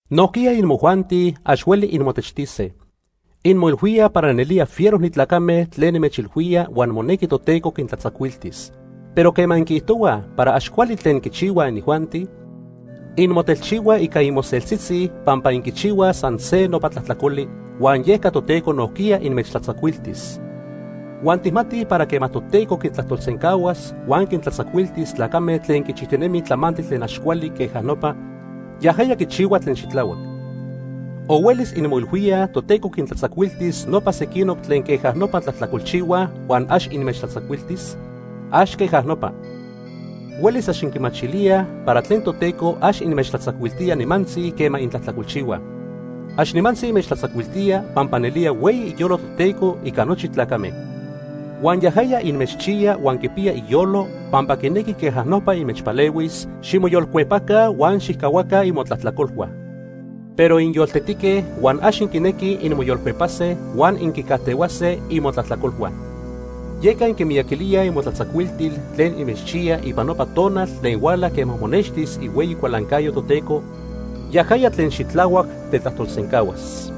Nojquiya imojuanti ax hueli inmotechtise. Inmoilhuíaj para nelía fiero ni tlacame tlen nimechilhuía huan monequi Toteco quintlatzacuiltis. Pero quema inquiijtohuaj para ax cuali tlen quichihuaj inijuanti, inmotelchihuaj ica imoseltitzitzi pampa inquichihuaj san se nopa tlajtlacoli, huan yeca Toteco nojquiya inmechtlatzacuiltis. Huan tijmatij para quema Toteco quintlajtolsencahuas huan quintlatzacuiltis tlacame tlen quichijtinemij tlamantli tlen ax cuali queja nopa, yajaya quichihua tlen xitlahuac. ¿O huelis inmoilhuíaj Toteco quintlatzacuiltis nopa sequinoc tlen queja nopa tlajtlacolchihuaj huan ax inmechtlatzacuiltis? ¡Ax queja nopa! Huelis ax inquimachilíaj para tlen Toteco ax inmechtlatzacuiltía nimantzi quema intlajtlacolchihuaj. Ax nimantzi inmechtlatzacuiltía pampa nelía hueyi iyolo Toteco ica nochi tlacame. Huan yajaya inmechchiya huan quipiya iyolo, pampa quinequi queja nopa inmechpalehuis ximoyolcuepaca huan xijcahuaca imotlajtlacolhua. Pero inyoltetique huan ax inquinequij inmoyolcuepase huan inquicajtehuase imotlajtlacolhua. Yeca inquimiyaquilíaj imotlatzacuiltil tlen inmechchiyaj ipan nopa tonal tlen huala quema monextis ihueyi cualancayo Toteco, yajaya tlen xitlahuac tetlajtolsencahuas.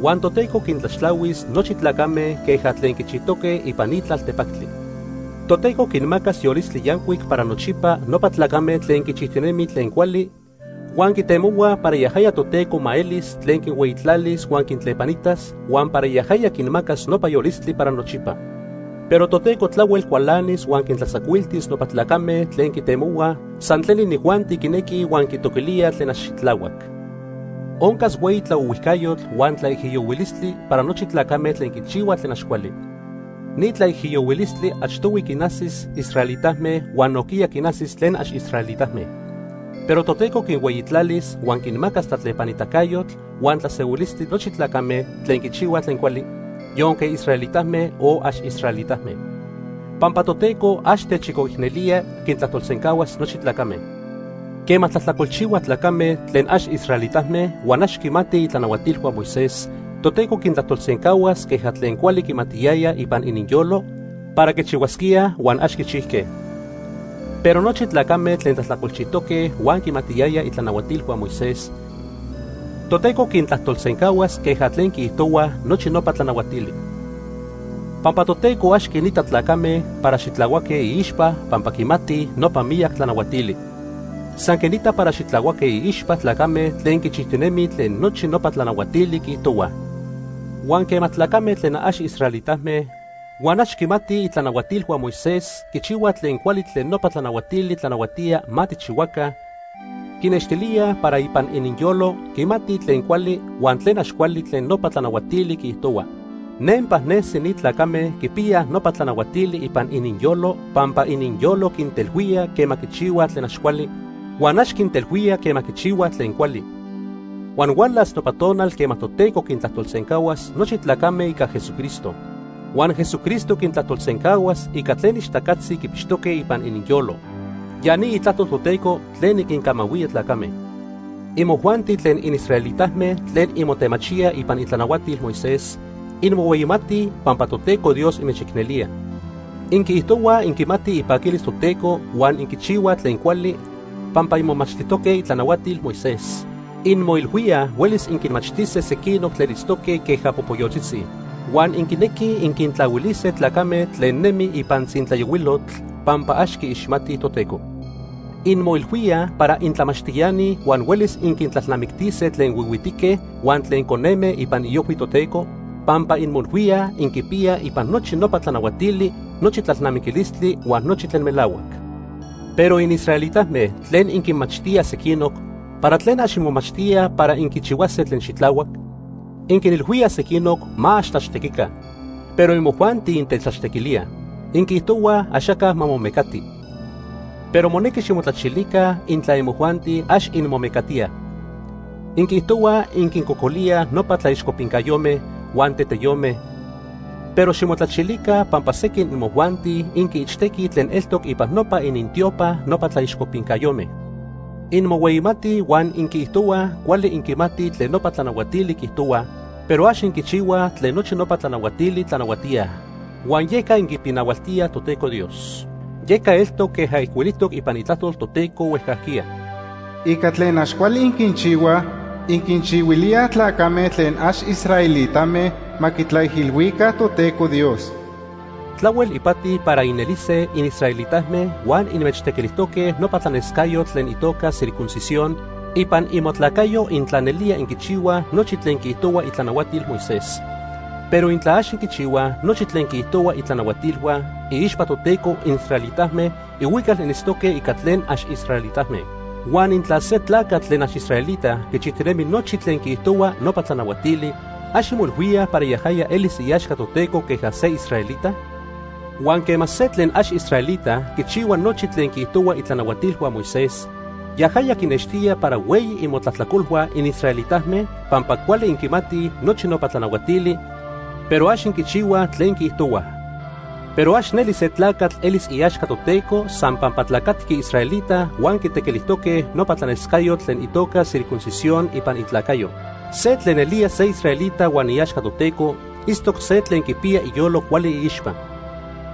Huan Toteco quintlaxtlahuis nochi tlacame queja tlen quichijtoque ipan ni tlaltepactli. Toteco quinmacas yolistli yancuic para nochipa nopa tlacame tlen quichijtinemij tlen cuali huan quitemohuaj para yajaya Toteco ma elis tlen quinhueyitlalis huan quintlepanitas, huan para yajaya quinmacas nopa yolistli para nochipa. Pero Toteco tlahuel cualanis huan quintlatzacuiltis nopa tlacame tlen quitemohuaj san tlen inijuanti quinequij huan quitoquilíaj tlen ax xitlahuac. Oncas hueyi tlaohuijcayotl huan tlaijiyohuilistli para nochi tlacame tlen quichihuaj tlen ax cuali. Ni tlaijiyohuilistli achtohui quinajsis israelitame huan nojquiya quinajsis tlen ax israelitame. Pero Toteco quinhueyitlalis huan quinmacas tlatlepanitacayotl huan tlasehuilistli nochi tlacame tlen quichihuaj tlen cuali, yonque israelitame o ax israelitame. Pampa Toteco ax techchicoicnelía, quintlajtolsencahuas nochi tlacame. Quema tlajtlacolchihuaj tlacame tlen ax israelitame huan ax quimatij itlanahuatilhua Moisés, Toteco quintlajtolsencahuas queja tlen cuali quimatiyayaj ipan ininyolo para quichihuasquíaj huan ax quichijque. Pero nochi tlacame tlen tlajtlacolchijtoque huan quimatiyayaj itlanahuatilhua Moisés, Toteco quintlajtolsencahuas queja tlen quiijtohuaj nochi nopa tlanahuatili. Pampa Toteco ax quinita tlacame para xitlahuaque iixpa pampa quimatij nopa miyac tlanahuatili. San quinita para xitlahuaque iixpa tlacame tlen quichijtinemij tlen nochi nopa tlanahuatili quiijtohuaj. Huan quema tlacame tlen ax israelitame huan ax quimatij itlanahuatilhua Moisés quichihuaj tlen cuali tlen nopa tlanahuatili tlanahuatíaj ma tijchihuaca, quinextilíaj para ipan ininyolo quimatij tlen cuali huan tlen ax cuali tlen nopa tlanahuatili quiijtohua. Nempa nesi ni tlacame quipiyaj nopa tlanahuatili ipan ininyolo pampa ininyolo quintelhuía quema quichihuaj tlen ax cuali, huan ax quintelhuía quema quichihuaj tlen cuali. Huan hualas nopa tonal quema Toteco quintlajtolsencahuas nochi tlacame ica Jesucristo. Huan Jesucristo quintlajtolsencahuas ica tlen ixtacatzi quipixtoque ipan ininyolo. Ya ni itlajtol Toteco tlen niquincamahuía tlacame. Imojuanti tlen inisraelitame tlen inmotemachíaj ipan itlanahuatil Moisés, inmohueyimatij pampa Toteco Dios inmechicnelía. Inquiijtohuaj inquimatij ipaquilis Toteco huan inquichihuaj tlen cuali pampa inmomachtijtoque itlanahuatil Moisés. Inmoilhuíaj huelis inquinmachtise sequinoc tlen itztoque queja popoyotzitzi. Huan inquinequij inquintlahuilise tlacame tlen nemij ipan tzintlayohuilotl pampa ax quiixmatij Toteco. Inmoilhuíaj para intlamachtiani huan huelis inquintlalnamictise tlen huihuitique huan tlen coneme ipan iojhui Toteco, pampa inmoilhuíaj inquipiyaj ipan nochi nopa tlanahuatili nochi tlalnamiquistli huan nochi tlen melahuac. Pero inisraelitame tlen inquinmachtíaj sequinoc, ¿para tlen ax inmomachtíaj para inquichihuase tlen xitlahuac? Inquinilhuíaj sequinoc ma ax tlaxtequica, pero imojuanti intetlaxtequilíaj. Inquiijtohuaj axaca ma momecati, pero monequi ximotlachilica intla imojuanti ax inmomecatíaj. Inquiijtohuaj inquincocolíaj nopa tlaixcopincayome huan teteyome, pero ximotlachilica pampa sequin imojuanti inquiichtequij tlen eltoc ipan nopa inintiopa nopa tlaixcopincayome. Inmohueyimatij huan inquiijtohuaj cuali inquimatij tlen nopa tlanahuatili quiijtohuaj, pero ax inquichihuaj tlen nochi nopa tlanahuatili tlanahuatíaj. Huan yeca inquipinahualtíaj Toteco Dios. Yeca eltoc queja ijcuilijtoc ipan Itlajtol Toteco huejcajquiya: “Ica tlen ax cuali inquinchihuaj, inquinchihuilíaj tlacame tlen ax israelitame ma quitlaijilhuica Toteco Dios.” Tlahuel ipati para inelise inisraelitame huan inmechtequilijtoque nopa tlanescayotl tlen itoca circuncisión ipan imotlacayo intla nelía inquichihuaj nochi tlen quiijtohua itlanahuatil Moisés. Pero intla ax inquichihuaj nochi tlen quiijtohuaj itlanahuatilhua, iixpa Toteco inisraelitame ihuical initztoque ica tlen ax israelitame. Huan intla se tlacatl tlen ax israelita quichijtinemi nochi tlen quiijtohuaj nopa tlanahuatili, ¿ax inmoilhuíaj para yajaya elis iaxca Toteco queja se israelita? Huan quema se tlen ax israelita quichihua nochi tlen quiijtohuaj itlanahuatilhua Moisés, yajaya quinextía para hueyi imotlajtlacolhua inisraelitame pampa cuali inquinmatij nochi nopa tlanahuatili, pero ax inquichihuaj tlen quiijtohuaj. Pero ax neli se tlacatl elis iaxca Toteco san pampa tlacatqui israelita huan quitequilijtoque nopa tlanescayotl tlen itoca circuncisión ipan itlacayo. Se tlen nelía se israelita huan iaxca Toteco itztoc se tlen quipiya iyolo cuali iixpa.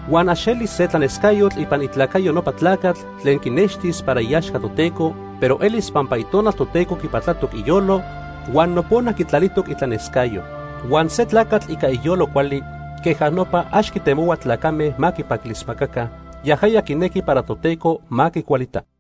Huan ax elis se tlanescayotl ipan itlacayo nopa tlacatl tlen quinextis para iaxca Toteco, pero elis pampa Itonal Toteco quipatlatoc iyolo huan nopona quitlalijtoc itlanescayo. Huan se tlacatl ica iyolo cuali queja nopa ax quitemohua tlacame ma quipaquilismacaca, yajaya quinequi para Toteco ma quicualita.